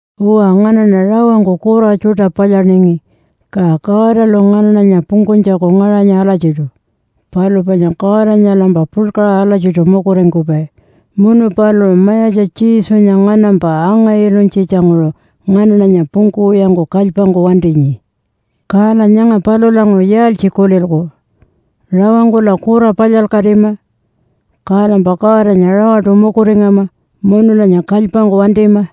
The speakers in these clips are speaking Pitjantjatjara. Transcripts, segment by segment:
Uwa, nganaṉa rawangku kura tjuṯa palyaningi, ka Godalu nganaṉanya pungkunytjaku ngaṟanyi alatjiṯu. Palu panya Godanyalampa puḻkaṟa alatjiṯu mukuringkupai, munu paluṟu Mayatja Jesunya nganampa anga-ilunytjitjanguṟu nganaṉanya pungkuwiyangku kalypangku wantinyi. Kala nyanga palulanguṟu yaaltji kulilku? Rawangkula kura palyalkatima? Kalampa Godanya rawaṯu mukuringama munulanya kalypangku wantima?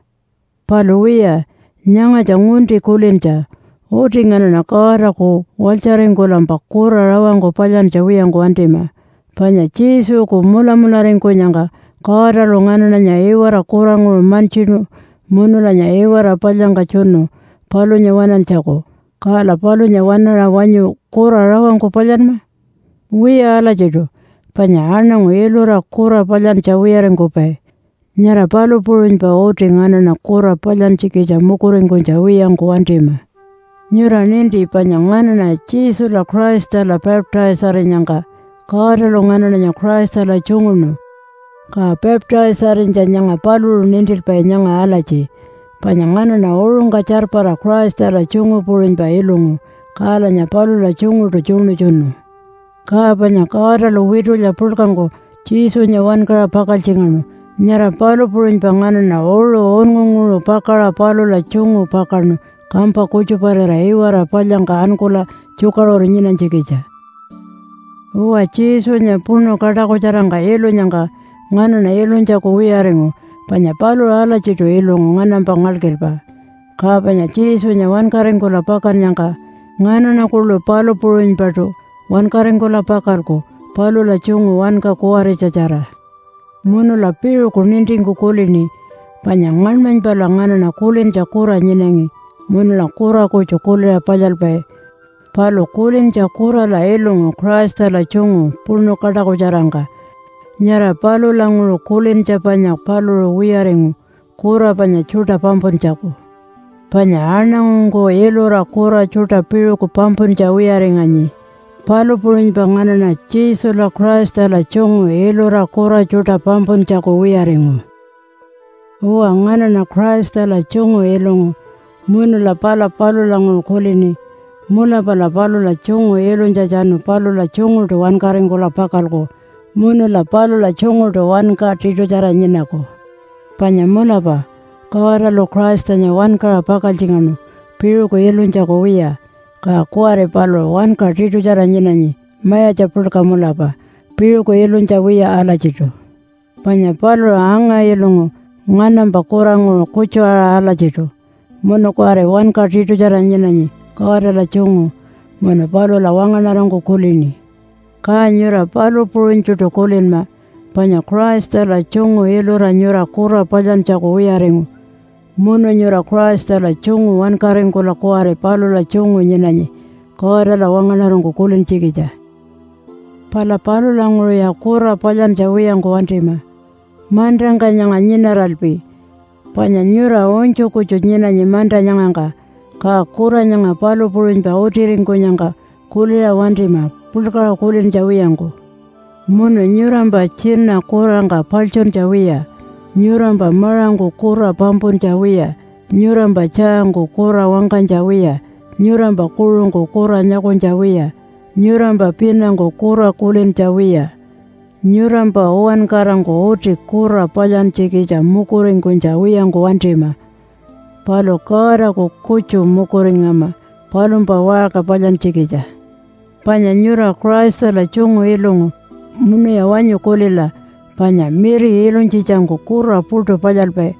Palu wiya, nyangatja ngunti kulintja. Uti nganaṉa Godaku walytjaringkulampa kura rawangku palyantja wiyangku wantima. Panya Jesuku mulamularingkunyangka Godalu nganaṉanya iwara kuranguṟu mantjinu munulanya iwara palyangka tjunu palunya waṉantjaku. Kala palunya waṉaṟa wanyu kura rawangku palyanma? Wiya alatjiṯu. Panya aṉangu ilura kura palyantja wiyaringkupai, nyara palu puṟunypa uti nganaṉa kura palyantjikitja mukuringkunytja wiyangku wantima. Nyura ninti panya nganaṉa Jesula Christala baptise-arinyangka Godalu nganaṉanya Christala tjunguṉu. Ka baptise-arinytja nyanga paluṟu nintilpai nyanga alatji panya nganaṉa uṟungka tjarpara Christala tjungu puṟunypa ilungu, kalanya palula tjunguṯu tjuṉutjunu. Ka panya Godalu witulya puḻkangku Jesunya wankaṟa pakaltjingaṉu, nyara palu puṟunypa nganaṉa uṟu unngunguṟu pakaṟa palula tjungu pakaṉu kampa kutjuparira iwara palyangka ankula tjukaṟuru nyinanytjikitja. Uwa Jesunya puṉu kaṯakutjarangka ilunyangka nganaṉa ilunytjaku wiyaringu panya paluṟu alatjiṯu ilungu nganampa ngalkilpa. Ka panya Jesunya wankaringkula pakannyangka, nganaṉa kuḻu palu puṟunypaṯu wankaringkula pakalku palula tjungu wanka kuwaritjatjara. Munula piṟuku nintingku kulini, panya ngaṉmanypala nganaṉa kulintja kura nyinangi munula kura kutju kuliṟa palyalpai. Palu kulintja kurala ilungu Christala tjungu puṉu kaṯakutjarangka. Nyara palulanguṟu kulintja panya paluṟu wiyaringu kura panya tjuṯa pampuntjaku. Panya aṉangungku ilura kura tjuṯa piṟuku pampuntja wiyaringanyi. Palu puṟunypa nganaṉa Jesula Christala tjungu ilura kura tjuṯa pampuntjaku wiyaringu. Uwa, nganaṉa Christala tjungu ilungu, munula pala palulanguṟu kulini, “Mulapala palula tjungu ilunytjatjanu palula tjunguṯu wankaringkula pakalku munula palula tjunguṯu wanka tiṯutjara nyinaku.” Panya mulapa Godalu Christanya wankaṟa pakaltjingaṉu piṟuku ilunytjaku wiya. Ka kuwari paluṟu wanka tiṯutjara nyinanyi mayatja puḻka mulapa piṟuku ilunytja wiya alatjiṯu. Panya paluṟu anga-ilungu nganampa kuranguṟu kutju-aṟa alatjiṯu, munu kuwari wanka tiṯutjara nyinanyi Godala tjungu munu palula wangaṉarangku kulini. Ka nyura palu puṟunytjuṯu kulinma, panya Christala tjungu ilura nyura kura palyantjaku wiyaringu, munu nyura Christala tjungu wankaringkula kuwari palula tjungu nyinanyi Godala wangaṉarangku kulintjikitja. Pala palulanguṟuya kura palyantja wiyangku wantima mantangka nyanga nyinaralpi. Panya nyura unytju kutju nyinanyi manta nyangangka, ka kura nyanga palu puṟunypa utiringkunyangka kuliṟa wantima puḻkaṟa kulintja wiyangku. Munu nyurampa tjina kurangka paḻtjuntja wiya, nyurampa maṟangku kura pampuntja wiya, nyurampa tjaangku kura wangkanytja wiya, nyurampa kuṟungku kura nyakunytja wiya, nyurampa pinangku kura kulintja wiya. Nyurampa uwankarangku uti kura palyantjikitja mukuringkunytja wiyangku wantima, palu Godaku kutju mukuringama palumpa waṟka palyantjikitja. Panya nyura Christala tjungu ilungu, munuya wanyu kulila panya miri ilunytjitjangku kura puṯu palyalpai,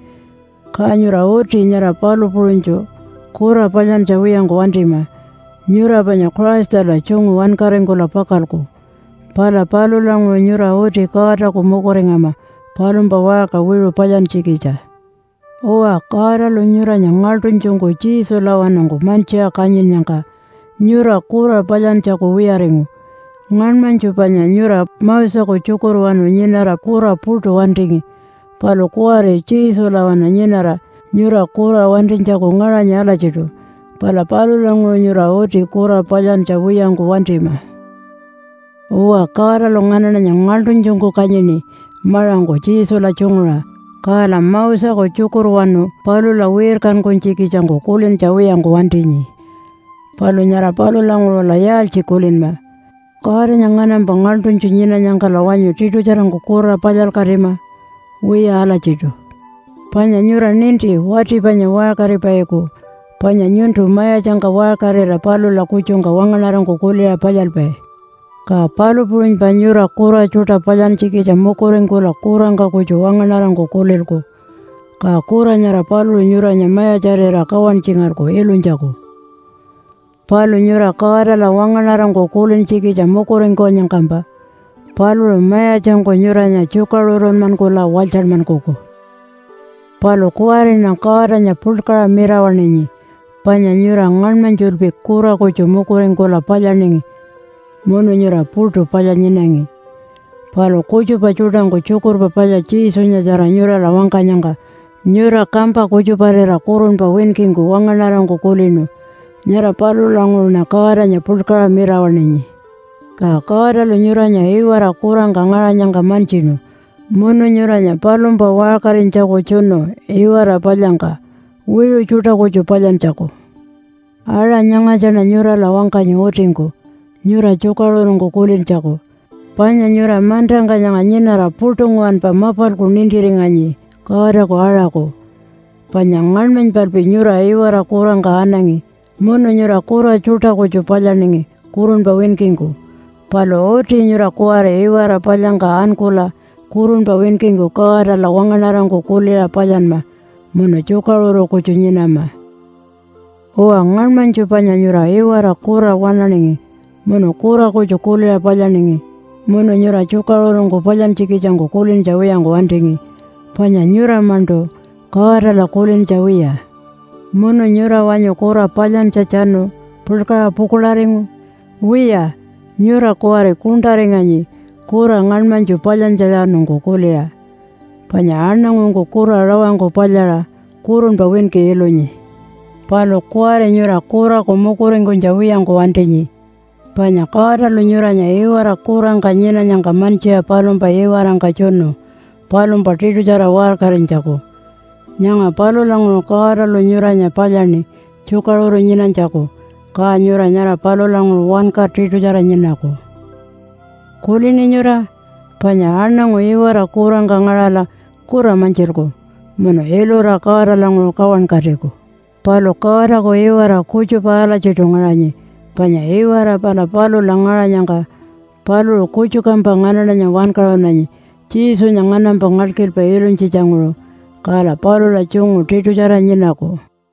ka nyura uti nyara palu puṟunytju kura palyantja wiyangku wantima. Nyura panya Christala tjungu wankaringkula pakalku. Pala palulanguṟu nyura uti Godaku mukuringama palumpa waṟka wiṟu palyantjikitja. Uwa, Godalu nyuranya ngaḻṯunytjungku Jesulawanungku mantjiṟa kanyinnyangka nyura kura palyantjaku wiyaringu. Ngaṉmanytju panya nyura Moseku tjukurwanu nyinara kura puṯu wantingi. Palu kuwari Jesulawanu nyinara nyura kura wantinytjaku ngaṟanyi alatjiṯu. Pala palulanguṟu nyura uti kura palyantja wiyangku wantima. Uwa, Godalu nganaṉanya ngaḻṯunytjungku kanyini maṟangku Jesula tjunguṟa, kala Moseku tjukurwanu palula wirkankunytjikitjangku kulintja wiyangku wantinyi. Palu nyara palulanguṟula yaaltji kulinma? Godanya nganampa ngaḻṯunytju nyinanyangkala wanyu tiṯutjarangku kura palyalkatima? Wiya alatjiṯu. Panya nyura ninti wati panya waṟkaripaiku. Panya nyuntu mayatjangka waṟkarira palula kutjungka wangaṉarangku kuliṟa palyalpai. Ka palu puṟunypa nyura kura tjuṯa palyantjikitja mukuringkula kurangka kutju wangaṉarangku kulilku, ka kura nyara paluṟu nyuranya mayatjarira kawantjingalku ilunytjaku. Palu nyura Godala wangaṉarangku kulintjikitja mukuringkunyangkampa paluṟu mayatjangku nyuranya tjukaṟurunmankula walytjanmankuku. Palu kuwariṉa Godanya puḻkaṟa mirawaṉinyi, panya nyura ngaṉmanytjulpi kura kutju mukuringkula palyaningi munu nyura puṯu palya nyinangi. Palu kutjupa tjuṯangku Tjukurpa Palya Jesunyatjara nyurala wangkanyangka nyura kampa kutjuparira kurunpa winkingku wangaṉarangku kulinu. Nyara palulanguṟuṉa Godanya puḻkaṟa mirawaṉinyi. Ka Godalu nyuranya iwara kurangka ngaṟanyangka mantjinu munu nyuranya palumpa waṟkarinytjaku tjunu iwara palyangka wiṟu tjuṯa kutju palyantjaku. (Aṟa nyangatjaṉa nyurala wangkanyi utingku nyura tjukaṟurungku kulintjaku, panya nyura mantangka nyanga nyinara puṯu nguwanpa mapalku nintiringanyi Godaku aṟaku.) Panya ngaṉmanypalpi nyura iwara kurangka anangi munu nyura kura tjuṯa kutju palyaningi kurunpa winkingku, palu uti nyura kuwari iwara palyangka ankula kurunpa winkingku Godala wangaṉarangku kuliṟa palyanma munu tjukaṟuru kutju nyinama. Uwa ngaṉmanytju panya nyura iwara kura waṉaningi munu kura kutju kuliṟa palyaningi. Munu nyura tjukaṟurungku palyantjikitjangku kulintja wiyangku wantingi panya nyura-maṉṯu Godala kulintja wiya. Munu nyura wanyu kura palyantjatjanu puḻkaṟa pukuḻaringu? Wiya, nyura kuwari kuṉṯaringanyi kura ngaṉmanytju palyantjatjanungku kuliṟa. Panya aṉangungku kura rawangku palyaṟa kurunpa winki ilunyi. Palu kuwari nyura kuraku mukuringkunytja wiyangku wantinyi, panya Godalu nyuranya iwara kurangka nyinanyangka mantjiṟa palumpa iwarangka tjunu palumpa tiṯutjara waṟkarinytjaku. Nyanga palulanguṟu Godalu nyuranya palyaṉi tjukaṟuru nyinanytjaku. Ka nyura nyara palulanguṟu wanka tiṯutjara nyinaku. Kulini nyura? Panya aṉangu iwara kurangka ngaṟala kura mantjilku munu ilura Godalanguṟu kawankatiku. Palu Godaku iwara kutjupa alatjiṯu ngaṟanyi panya iwara pala palula ngaṟanyangka paluṟu kutjukampa nganaṉanya wankaṟunanyi Jesunya nganampa ngalkilpa ilunytjitjanguṟu, kala palula tjungu tiṯutjara nyinaku.